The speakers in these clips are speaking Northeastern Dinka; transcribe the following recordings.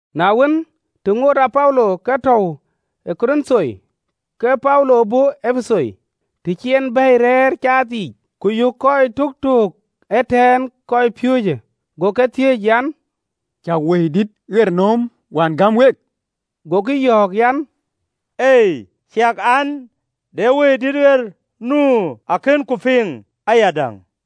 Na wën, të ŋoot Apolo ke tɔ̈u ë Korinth, ke Paulo bɔ̈ Epetho, të cï en bɛ̈i rɛɛr caath yiic, ku yök kɔc töktöök ëtɛ̈ɛ̈n kɔcpiööcë: go ke thiëëc an, “Cäk Wëidït ɣer nööm wään gäm wek?” Gokï yɔ̈ɔ̈k an, “Ei, ciɛk an, de Wëidït ɣer nu akënku piŋ ayadäŋ.”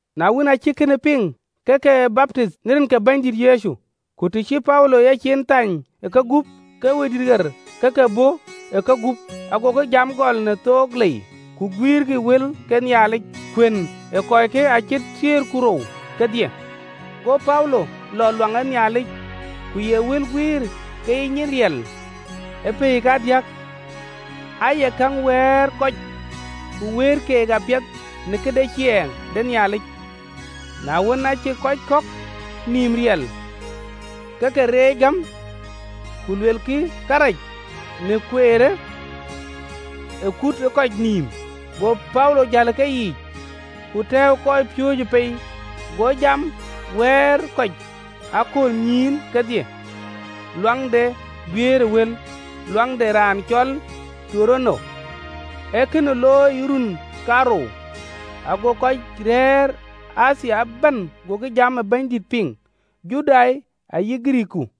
Na wën, aa cïk kënë piŋ, ke ke baptith në rin ke Bɛ̈nydït Yecu. Ku të cï Paulo yecin thany ë kegup, ke Wëidït ɣer ke ke bɔ̈ ë kegup, agokï jam gɔl në thook lei, ku guiirkï wël ke Nhialic. Kuën ee kɔckë acït thiëër ku rou kedhie. Go Paulo lɔ luaŋ ë Nhialic, ku ye wël guiir ke ye nyin riɛl ë pɛ̈i kadiäk, aaye käŋ wɛ̈ɛ̈r yiic kɔc, ku wëët keek apiɛth në këde ciɛɛŋ de Nhialic. Na wën, aacï kɔc kɔ̈k nïïm riɛl, ke ke reec gäm, ku luelkï kërac në biäk de Kueer në akutnɔm ë kɔc nïïm, go Paulo jäl ë keyiic, ku tɛ̈ɛ̈u kɔcpiööcë pei, go jam wɛ̈ɛ̈r kɔc ë aköölnyïïn kedhie luaŋ de guiëër ë wël, luaŋ de raan cɔl Turano. Ee kënë looi ë run kaarou, ago kɔc rɛ̈ɛ̈r ë Athia ëbɛ̈n gokï jam ë Bɛ̈nydït piŋ, Judai ayï Girikii.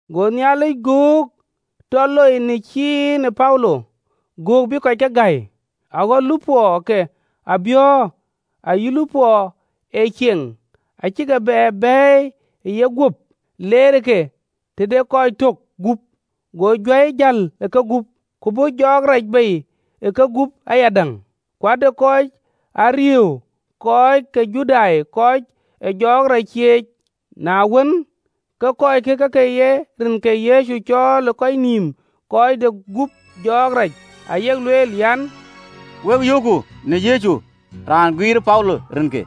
Go Nhialic göök tɔ loi në cin ë Paulo, göök bï kɔc ke gäi. Aɣɔ̈l lupɔɔ ke abiɔ̈ɔ̈r ayï lupɔɔ ee cieŋ, acï ke bɛ̈ɛ̈i bei ë yeguöp, leerëke tëde kɔc tök gup, go juäi jäl ë kegup, ku bɔ̈ jɔɔk rac bei ë kegup ayadäŋ. Ku ade kɔc ke Judai ariëëu, kɔc ee jɔɔk rac cieec. Na wën, ke kɔckë ke ke ye rin ke Yecu cɔɔl ë kɔc nïïm kɔc de gup jɔɔk rac, ayek lueel an, “Wek yöökku në rin ke Yecu, raan guiirë Paulo rinke.”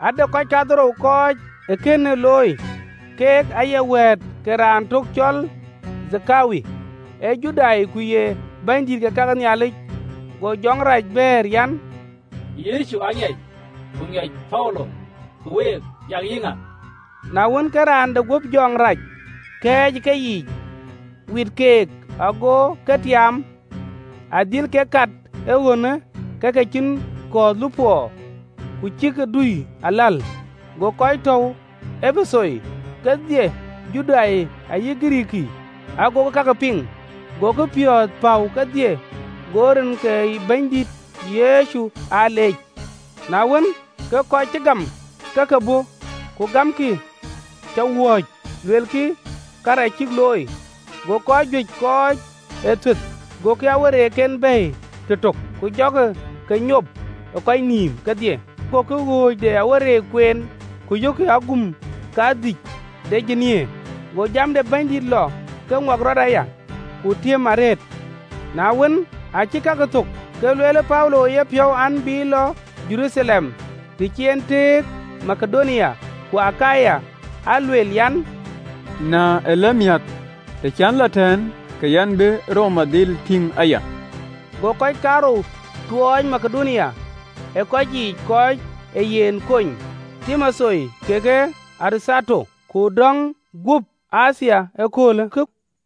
Ade kɔc kadhorou kɔc ee kënë looi, kek ayek wɛ̈ɛ̈t ke raan tök cɔl Thekewa, ee Judai, ku ye bɛ̈nydïït ë kake Nhialic. Go jɔŋ rac bɛ̈ɛ̈r an, “Yecu aŋiɛc, ku ŋiɛc Paulo, ku week yak yïŋa?” Na wën, ke raan de guöp jɔŋ rac kɛɛc ë keyiic, wit keek, ago ke tiaam, adhil kek kat ee ɣönë ke ke cïn kɔ̈ɔ̈th lupɔɔ, ku cï ke dui aläl. Go kɔc tɔ̈u ë Epetho kedhie, Judai ayï Girikii, agokï kakë piŋ, gokï piɔ̈ɔ̈th päu kedhie, go rin ke Bɛ̈nydït Yecu aa leec. Na wën, ke kɔc cï gam ke ke bɔ̈, ku gamkï cä wööc, luelkï karɛc cïk looi. Go kɔc juëc kɔc ee thuëth gokï awereekken bɛ̈ɛ̈i tëtök, ku jɔkï ke nyop ë kɔc nïïm kedhie. Gokï ɣööc de awereek kueen, ku yökkï agum kadhïny de ateek. Go jam de Bɛ̈nydït lɔ ke ŋuak rɔt aya, ku tiëm arëët. Na wën, aacï kakë thök, ke lueel Paulo e yepiɔ̈u an, bï lɔ Jeruthalem, të cï en tëëk Makedonia ku Akaya, alueel an, “Na ëlëmiäk, të cän lɔ tɛ̈ɛ̈n, ke yɛn bï Roma dhil tïŋ aya.” Go kɔc kaarou tuɔɔc Makedonia ë kɔc yiic kɔc ee yen kony, Timotheo kekë Erathato, ku döŋ guöp Athia ë aköölkë.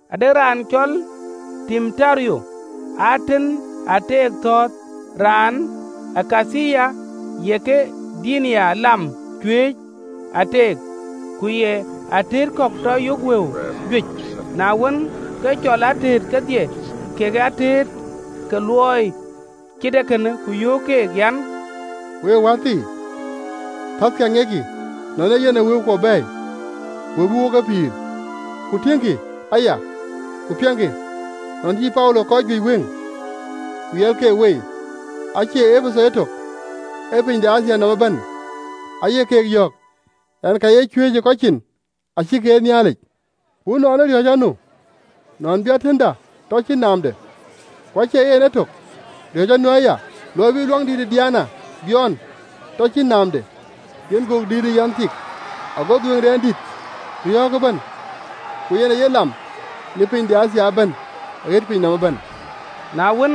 Ade raan cɔl Demeturio, atën ee ateek thɔ̈ɔ̈th, raan ë kathii ye ke Diana lam cuëëc ë ateek, ku ye atëët kɔ̈k tɔ yök wëu juëc. Na wën, ke cɔl atëët kedhie, kekë atëët ke luɔi cït ee kënë, ku yöök keek an, “Week wäthii, thäthë aŋiɛckï nɔn ee yen ee wëukuɔ bɛ̈ɛ̈i, wëu bï wok ke pïïr. Ku tiëŋkï aya ku piɛŋkï, nɔn cï Paulo kɔc juëc wëŋ ku yɛl keek wei, acie Epetho etök, ee piny de Athia nɔm ëbɛ̈n, aye keek yɔ̈ɔ̈k an, ka ye cuëëc ë kɔc cin, acïkï ee Nhialic. Ku ënɔɔnë riɔ̈ɔ̈c anu, nɔn bï tëëtda tɔ cïn naamde, ku acie en etök, riɔ̈ɔ̈c anu aya, luɔi bï luaŋdït ë Diana biɔɔn, ku tɔ cïn naamde, yen gök dïït ë yanh ë tik, ago dhuëëŋdɛn dït riɔ̈ɔ̈k ëbɛ̈n, ku yen aye lam në piny de Athia ëbɛ̈n, aɣet piny nɔm ëbɛ̈n!” Na wën,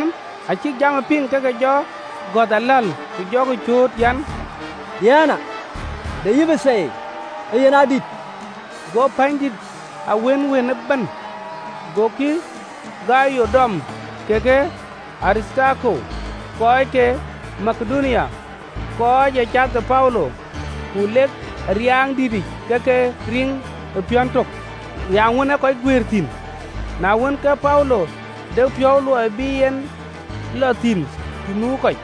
aa cïk jamë piŋ, ke ke göth aläl, ku jɔkï cööt an, “Diana de Epetho yen adït!” Go pänydït a wënwën ëbɛ̈n. Gokï Gayo dɔm kekë Aritharko, kɔc ke Makedonia, kɔc ee cath ë Paulo, ku lek ë riaaŋdïtic ke ke riŋ ë piɔ̈n tök, riaaŋ wën ee kɔc guëër thïn. Na wën, ke Paulo de piɔ̈u luɔi bï en lɔ thïn të nu kɔc,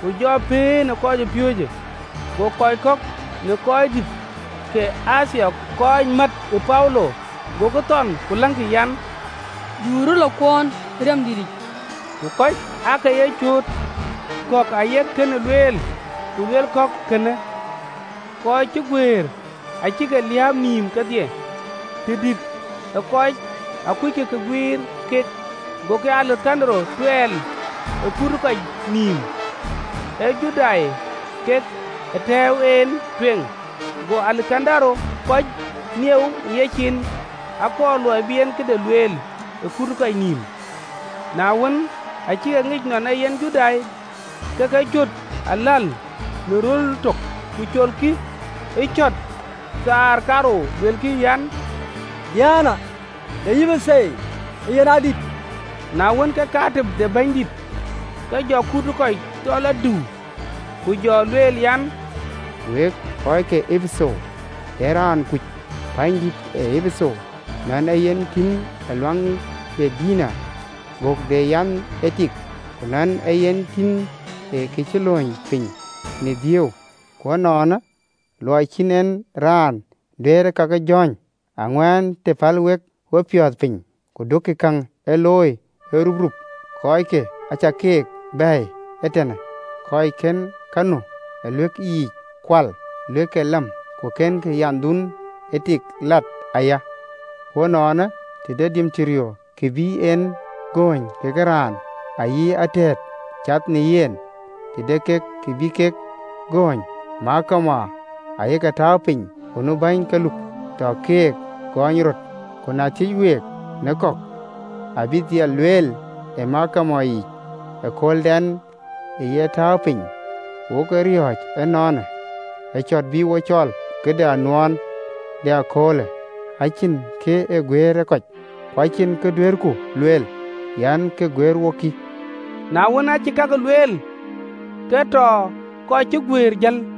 ku jɔ pëën ë kɔcpiööcë. Go kɔc kɔ̈k në röördït ke Athia, kɔc määth ë Paulo, gokï thɔn ku läŋkï an, du rɔt lɔ kuɔɔn ë riaaŋdïtic. Ku kɔc aake ye cööt, kɔ̈k ayek kënë lueel, ku luel kɔ̈k kënë: amatnɔm wën cï guëër acïk nïïm liääp kedhie, tëdït ë kɔc akuckï kë ë guëër kek. Gokï Alekandaro tuɛɛl ë kut ë kɔc nïïm, ee Judai kek aa tɛ̈ɛ̈u en tueŋ. Go Alekandaro kɔc nieu ë yecin, akɔɔr luɔi bï en këde lueel ë kut ë kɔc nïïm. Na wën, aa cïk e ŋic nɔn ee yen Judai, ke ke cöt aläl në röl tök, ku cötkï ë kë cït thaar kaarou, luelkï an, “Diana de Epetho yen adït.” Na wën, ke raan ee kake pänydït gɔ̈ɔ̈r ke jɔ kut ë kɔc tɔ lɔ diu, ku jɔ lueel an, “Week, kɔc ke Epetho, de raan kuc pänydït Epetho, nɔn ee yen tïn ë luaŋ de Diana, gök de yanh ë tik, ku nɔn ee yen tïn ë kë cï lööny piny tënhial në Dhio? Ku ënɔɔnë, luɔi cïn en raan duëër kake jɔ̈ɔ̈ny, aŋuän të päl wek wepiɔ̈ɔ̈th piny, ku duökï käŋ ee looi ëruprup. Kɔckë acäk keek bɛ̈ɛ̈i ee tënë, kɔc kën ka nu ë luëk yiic kual luëk ke lam, ku kënkï yanhduön ë tik lat aya. Ku ënɔɔnë, të de Demeturio kë bï en gööny kekë raan ayï atëët cath në yen, të de kek kë bï kek gööny, gɔny aye ke tääu piny, ku nu bäny ke luk, tɔkï keek gɔɔny röt. Ku na thiëëc week në kɔ̈k, abï dhil lueel ë gɔny yic ë kööldɛn cï amatnɔm tääu piny. Wok riɔ̈c ënɔɔnë, ë cɔ̈t bï wo cɔɔl në këde anuɔɔn de ee köölë, acïn kë ë guëër ë kɔc, ku acïn kë duëërku lueel an, kë ë guëër wok, kï.” Na wën, aacï kake lueel, ke tɔ amatnɔm cï guëër jël.